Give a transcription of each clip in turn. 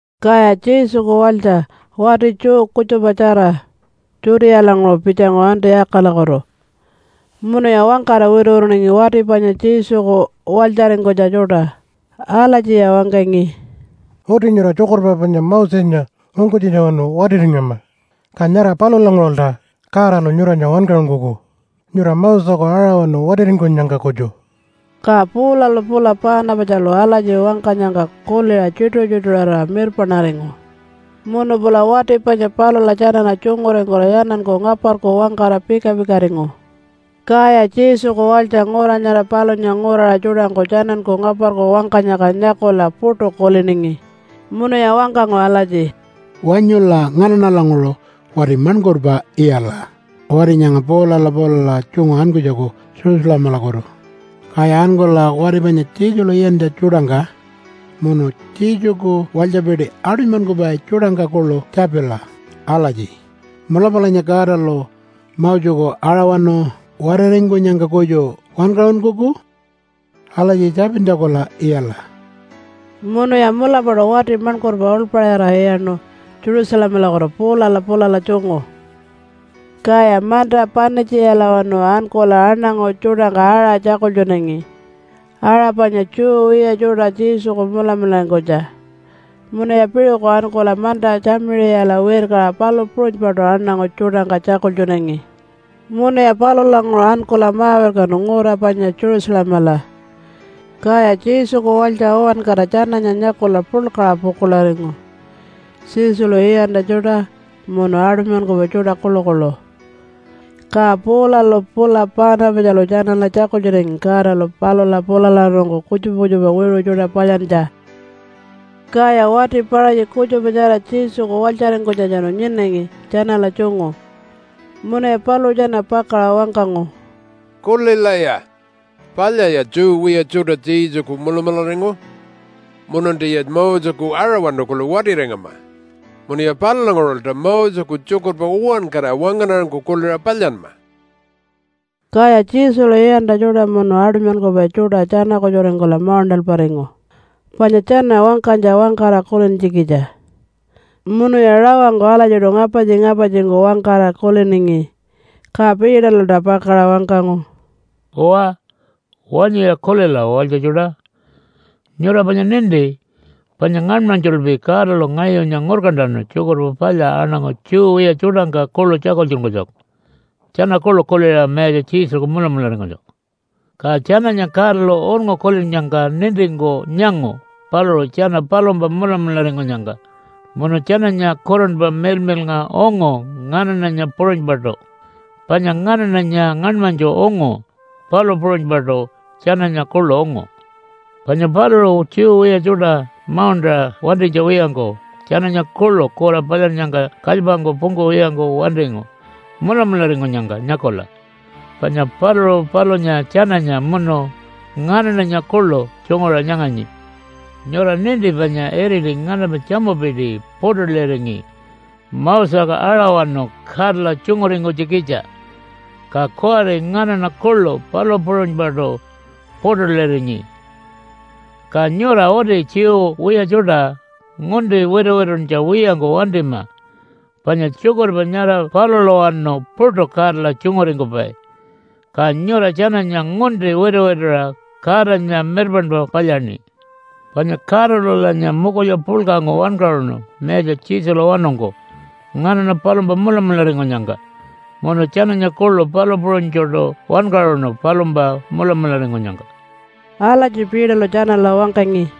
Kaya Jesuku walytja wati Jew kutjupatjara Judealanguṟu pitjangu Antiyakalakutu, munuya wangkara wituwituningi wati panya Jesuku walytjaringkunytja tjuṯa. Alatjiya wangkangi, “Uti nyura tjukurpa panya Mosenya ungkunytjitjawanu watiringama, ka nyara palulanguṟulta Godalu nyuranya wankaṟunkuku nyura Moseku aṟawanu watiringkunyangka kutju.” Ka Paulalu pula Paanapatjalu alatji wangkanyangka kuliṟa tjituṟu-tjituṟurira mirpaṉaringu, munu pula wati panya palula tjanala tjunguringkula tjananku ngaparku wangkara pika-pikaringu. Kaya Jesuku walytja ngura nyara palunya nguraṟa tjuṯangku, tjananku ngaparku wangkanyangka nyakula puṯu kuliningi, munuya wangkangu alatji, “Wanyula nganaṉalanguṟu wati maṉkurpa iyala wati nyanga Paulala pulala tjungu ankunytjaku Jerusalemalakutu, kaya ankula wati panya Jesulu iyantja tjuṯangka munu Jesuku walytjapiti aṯunymankupai tjuṯangka kuḻu tjapila alatji, ‘Mulapalanya Godalu Moseku aṟawanu watiringkunyangka kutju wankaṟunkuku?’ Alatji tjapintjakula iyala.” Munuya mulapaṯu wati maṉkurpa uḻpaṟira iyaṉu Jerusalemalakutu Paulala pulala tjungu. Kaya manta Panitjiyalawanu ankula aṉangu tjuṯangka aṟa tjakultjunangi, aṟa panya Jew wiya tjuṯa Jesuku mulamularingkunytja. Munuya piṟuku ankula manta Tjamiṟiyala wirkaṟa palu puṟunypaṯu aṉangu tjuṯangka tjakultjunangi. Munuya palulanguṟu ankula ma-wirkanu ngura panya Jerusalemala, kaya Jesuku walytja uwankara tjananya nyakula puḻkaṟa pukuḻaringu, Jesulu iyantja tjuṯa munu aṯunymankupai tjuṯa kuḻukuḻu. Ka Paulalu pula Paanapatjalu tjanala tjakultjunangi Godalu palula pulalawanungku kutjupa kutjupa wiṟu tjuṯa palyantja. Kaya wati Paṟatji kutjupatjara Jesuku walytjaringkunytjatjanu nyinangi tjanala tjungu, munuya paluṟu tjana pakaṟa wangkangu, “Kulilaya! Palyaya Jew wiya tjuṯa Jesuku mulamularingu, mununtiya Moseku aṟawanu kuḻu watiringama munuya palulanguṟulta Moseku tjukurpa uwankara wangaṉarangku kuliṟa palyanma.” Kaya Jesulu iyantja tjuṯa munu aṯunymankupai tjuṯa tjana-kutjuringkula mauṉṯalparingu panya tjana wangkanytja wangkara kulintjikitja. Munuya rawangku alatjiṯu ngapartji-ngapartjingku wangkara kuliningi. Ka Peterlulta pakaṟa wangkangu, “Uwa, wanyuya kulila walytja tjuṯa! Nyura panya ninti panya ngaṉmanytjulpi Godalu ngayunya ngurkantanu Tjukurpa Palya aṉangu Jew wiya tjuṯangka kuḻu tjakultjunkunytjaku tjana kuḻu kuliṟa Mayatja Jesuku mulamularingkunytjaku. Ka tjananya Godalu unngu kulinnyangka nintingku nyangu paluṟu tjana palumpa mulamularingkunyangka munu tjananya Kurunpa Miḻmiḻnga ungu nganaṉanya puṟunypaṯu, panya nganaṉanya ngaṉmanytju ungu, palu puṟunypaṯu tjananya kuḻu ungu. Panya paluṟu Jew wiya tjuṯa mauṉṯaṟa wantinytja wiyangku tjananya kuḻu kura palyannyangka kalypangku pungkuwiyangku wantingu mulamularingkunyangka nyakula. Panya paluṟu palunya tjananya munu nganaṉanya kuḻu tjunguṟa nyanganyi. Nyura ninti panya iriti nganampa tjamupiti puṯuliringi Moseku aṟawanu Godala tjunguringkunytjikitja, ka kuwari nganaṉa kuḻu palu puṟunypaṯu puṯulirinyi. Ka nyura uti Jew wiya tjuṯa ngunti wituwituntja wiyangku wantima panya tjukurpa nyara palulawanu puṯu Godala tjunguringkupai. Ka nyura tjananya ngunti wituwituṟa Godanya mirpaṉpa palyaṉi. Panya Godalulanya mukulya puḻkangku wankaṟunu Mayatja Jesulawanungku nganaṉa palumpa mulamularingkunyangka munu tjananya kuḻu palu puṟunytjuṯu wankaṟunu palumpa mulamularingkunyangka.” Alatji Peterlu tjanala wangkangi.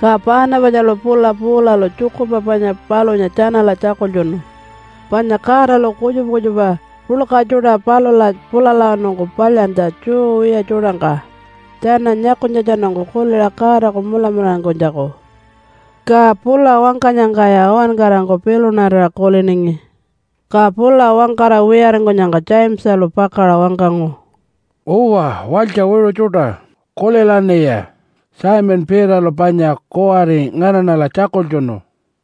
Ka Paanapatjalu pula Paulalu tjukurpa panya palunya tjanala tjakultjunu, panya Godalu kutjupa kutjupa puḻka tjuṯa palula pulalawanungku palyantja Jew wiya tjuṯangka, tjana nyakunytjatjanungku kuliṟa Godaku mulamularingkunytjaku. Ka pula wangkanyangkaya uwankarangku pilunarira kuliningi. Ka pula wangkara wiyaringkunyangka Jamesalu pakaṟa wangkangu, “Uwa, walytja wiṟu tjuṯa, kulilaṉiya! Simon Peterlu panya kuwari nganaṉala tjakultjunu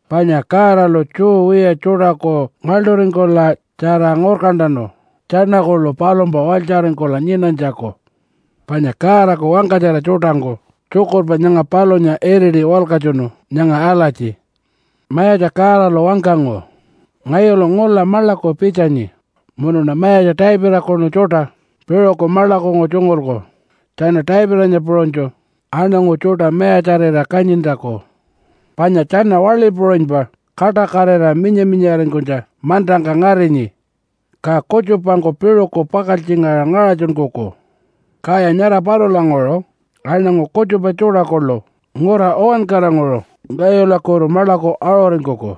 panya Godalu Jew wiya tjuṯaku ngaḻṯuringkula tjara ngurkantanu tjana kuḻu palumpa walytjaringkula nyinanytjaku. Panya Godaku wangkatjara tjuṯangku tjukurpa nyanga palunya iriti walkatjunu nyanga alatji, ‘Mayatja Godalu wangkangu, “Ngayulu ngula maḻaku pitjanyi munuṉa Mayatja Davidakunu tjuṯa piṟuku maḻakungku tjungulku tjana Davidanya puṟunytju aṉangu tjuṯa mayatjarira kanyintjaku. Panya tjana waḻi puṟunypa kaṯakatira minya-minyaringkunytja mantangka ngarinyi, ka kutjupangku piṟuku pakaltjingaṟa ngaṟatjunkuku. Kaya nyara palulanguṟu aṉangu kutjupa tjuṯa kuḻu ngura uwankaranguṟu ngayulakutu maḻaku aṟuringkuku,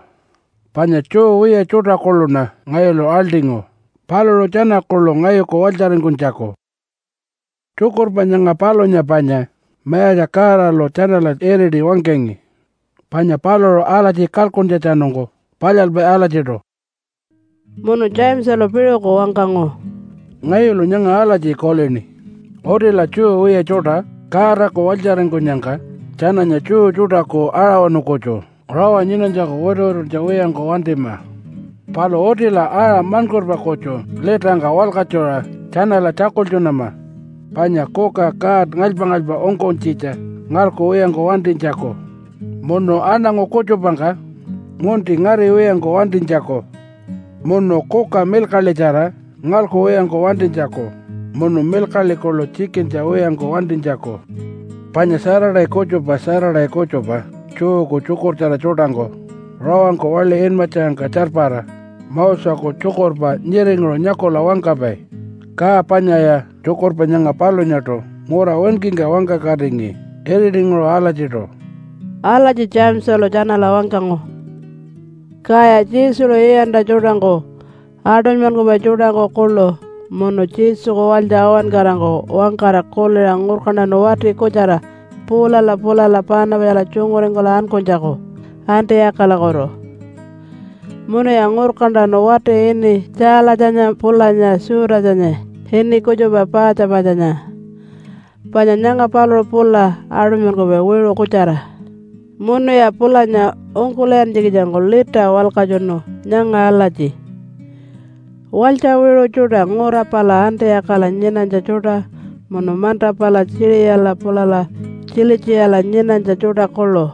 panya Jew wiya tjuṯa kuḻuṉa ngayulu aḻṯingu paluṟu tjana kuḻu ngayuku walytjaringkunytjaku.” Tjukurpa nyanga palunya panya Mayatja Godalu tjanala iriti wangkangi. Panya paluṟu alatji kalkuntjatjanungku palyalpai alatjiṯu.’” Munu Jamesalu piṟuku wangkangu, “Ngayulu nyanga alatji kulini. Utila Jew wiya tjuṯa Godaku walytjaringkunyangka tjananya Jew tjuṯaku aṟawanu kutju rawa nyinanytjaku wituwituntja wiyangku wantima. Palu utila aṟa maṉkurpa kutju litangka walkatjuṟa tjanala tjakultjunama panya kuka god ngalypa-ngalypa ungkunytjitja ngalkuwiyangku wantinytjaku, munu aṉangu kutjupangka ngunti ngariwiyangku wantinytjaku, munu kuka milkaḻitjara ngalkuwiyangku wantinytjaku, munu milkaḻi kuḻu tjikintja wiyangku wantinytjaku. Panya Saturday kutjupa Saturday kutjupa Jewku tjukurtjara tjuṯangku rawangku waḻi inmatjangka tjarpara Moseku tjukurpa nyiringuṟu nyakula wangkapai, ka panyaya tjukurpa nyanga palunyaṯu ngura winkingka wangkakatingi iritinguṟu alatjiṯu.” Alatji Jamesalu tjanala wangkangu. Kaya Jesulu iyantja tjuṯangku, aṯunymankupai tjuṯangku kuḻu, munu Jesuku walytja uwankarangku wangkara kuliṟa ngurkantanu wati kutjara Paulala pulala Paanapatjala tjunguringkula ankunytjaku Antiyakalakutu. Munuya ngurkantanu wati ini Tjaalatjanya pulanya Judasanya ini kutjupa Paatjapatjanya. Panya nyanga paluṟu pula aṯunymankupai wiṟu kutjara. Munuya pulanya ungkul'iyantjikitjangku lita walkatjunu nyanga alatji, Walytja wiṟu tjuṯa ngura pala Antiyakala nyinanytja tjuṯa, munu manta pala Tjiṟiyala pulala Tjilitjiyala nyinanytja tjuṯa kuḻu!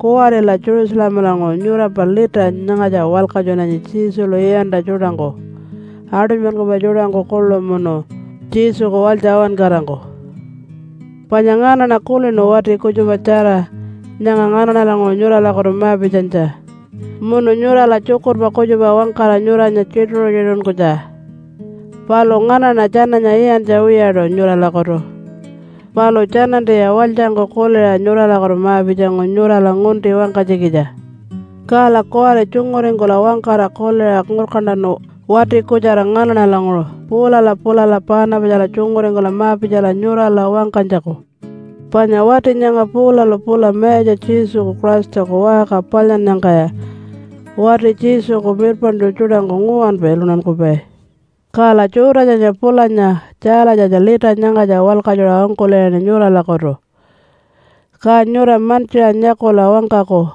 Kuwarila Jerusalemalanguṟu nyurampa lita nyangatja walkatjunanyi Jesulu iyantja tjuṯangku, aṯunymankupai tjuṯangku kuḻu, munu Jesuku walytja uwankarangku. Panya nganaṉa kulinu wati kutjupatjara, nyanga nganaṉalanguṟu nyuralakutu ma-pitjanytja, munu nyurala tjukurpa kutjupa wangkara nyuranya tjituṟu-tjituṟunkunytja. Palu nganaṉa tjananya iyantja wiyaṯu nyuralakutu. Palu tjanantiya walytjangku kuliṟa nyuralakutu ma-pitjangu nyurala ngunti wangkanytjikitja. Kala kuwari tjunguringkula wangkara kuliṟa ngurkantanu, wati kutjara nganaṉalanguṟu Paulala pulala Paanapatjala tjunguringkula ma-pitjala nyurala wangkanytjaku. Panya wati nyanga Paulalu pula Mayatja Jesuku Christaku waṟka palyannyangkaya wati Jesuku mirpaṉtju tjuṯangku nguwanpa iluntankupai. Kala Judasanya pulanya Tjaalatjanya lita nyangatja walkatjuṟa ungkul'iyaṉi nyuralakutu, ka nyura mantjiṟa nyakula wangkaku,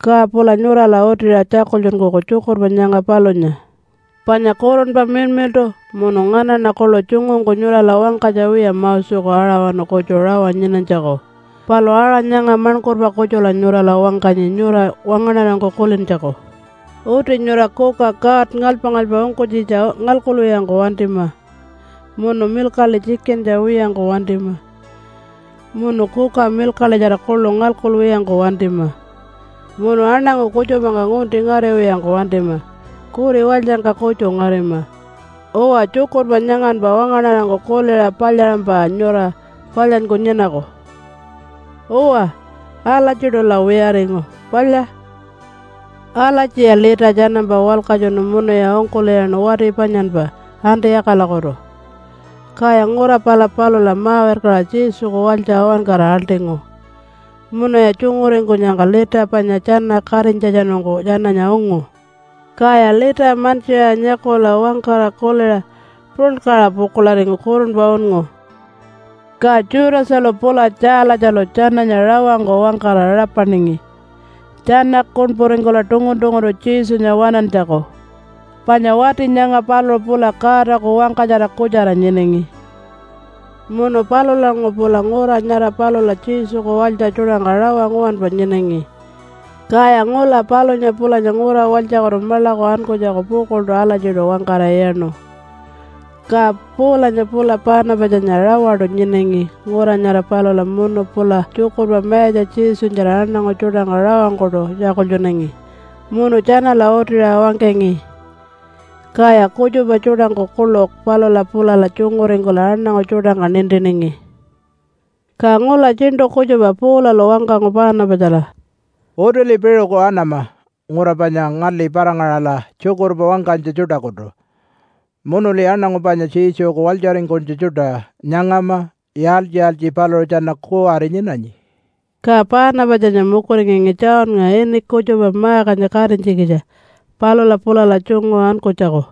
ka pula nyurala utiṟa tjakultjunkuku tjukurpa nyanga palunya. Panya Kurunpa Miḻmiḻṯu munu nganaṉa kuḻu tjungungku nyurala wangkanytja wiya Moseku aṟawanu kutju rawa nyinanytjaku. Palu aṟa nyanga maṉkurpa kutjula nyurala wangkanyi, nyura wangaṉarangku kulintjaku. Uti nyura kuka god ngalypa-ngalypa ungkunytjitja ngalkuwiyangku wantima, munu milkaḻi tjikintja wiyangku wantima, munu kuka milkaḻitjara kuḻu ngalkuwiyangku wantima, munu aṉangu kutjupangka ngunti ngariwiyangku wantima kuri walytjangka kutju ngarima. Uwa, tjukurpa nyanganpa wangaṉarangku kuliṟa palyaṟampa nyura palyanyku nyinaku. Uwa, alatjiṯula wiyaringu. Palya! Alatjiya lita tjanampa walkatjunu munuya ungkul'iyaṉu wati panyanpa Antiyakalakutu. Kaya ngura pala palula ma-wirkaṟa Jesuku walytja uwankara aḻṯingu munuya tjunguringkunyangka lita panya tjana katinytjatjanungku tjananya ungu. Kaya lita mantjiṟa nyakula wangkara kuliṟa puḻkaṟa pukuḻaringu kurunpa unngu. Ka Judasalu pula Tjaalatjalu tjananya rawangku wangkara rapaningi tjana kuṉpuringkula tungun-tunguntu Jesunya waṉantjaku, panya wati nyanga paluṟu pula Godaku wangkatjara kutjara nyinangi. Munu palulanguṟu pula ngura nyara palula Jesuku walytja tjuṯangka rawa nguwanpa nyinangi, kaya ngula palunya pulanya ngura walytjakutu maḻaku ankunytjaku pukuḻṯu alatjiṯu wangkara iyaṉu. Ka Paulanya pula Paanapatjanya rawaṯu nyinangi ngura nyara palula munu pula tjukurpa Mayatja Jesunyatjara aṉangu tjuṯangka rawangkuṯu tjakultjunangi munu tjanala utiṟa wangkangi. Kaya kutjupa tjuṯangku kuḻu palula pulala tjunguringkula aṉangu tjuṯangka nintiningi. Ka ngula tjiṉṯu kutjupa Paulalu wangkangu Paanapatjala, “Utili piṟuku anama ngura panya ngali para-ngaṟala tjukurpa wangkanytja tjuṯakutu, munuli aṉangu panya Jesuku walytjaringkunytja tjuṯa nyangama yaaltji-yaaltji paluṟu tjana kuwari nyinanyi.” Ka Paanapatjanya mukuringangi Johnnga ini kutjupa Markanya katinytjikitja palula pulala tjungu ankunytjaku.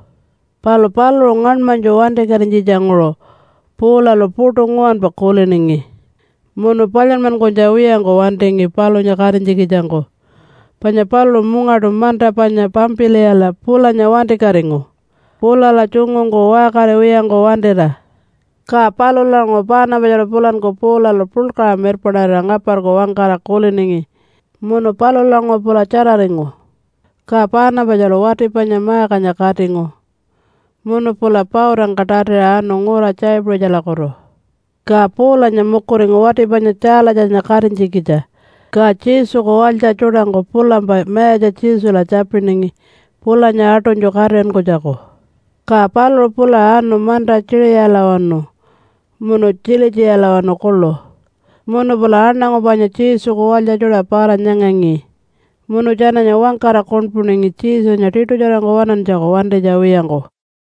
Palu paluṟu ngaṉmanytju wantikatinytjitjanguṟu Paulalu puṯu nguwanpa kuliningi, munu palyanmankunytja wiyangku wantingi palunya katinytjikitjangku. Panya paluṟu mungaṯu manta panya Pampiliyala pulanya wantikatingu, pulala tjungungku waṟkariwiyangku wantira. Ka palulanguṟu Paanapatjalu pulanku Paulalu puḻkaṟa mirpaṉarira ngaparku wangkara kuliningi, munu palulanguṟu pula tjararingu. Ka Paanapatjalu wati panya Markanya katingu, munu pula pautangka tatiṟa anu ngura Tjaipuṟitjalakutu. Ka Paulanya mukuringu wati panya Tjaalatjanya katinytjikitja. Ka Jesuku walytja tjuṯangku pulampa Mayatja Jesula tjapiningi pulanya aṯunytju katiṟinkunytjaku. Ka paluṟu pula anu manta Tjiṟiyalawanu munu Tjilitjiyalawanu kuḻu, munu pula aṉangu panya Jesuku walytja tjuṯa para-nyangangi, munu tjananya wangkara kuṉpuningi Jesunya tiṯutjarangku waṉantjaku, wantinytja wiyangku.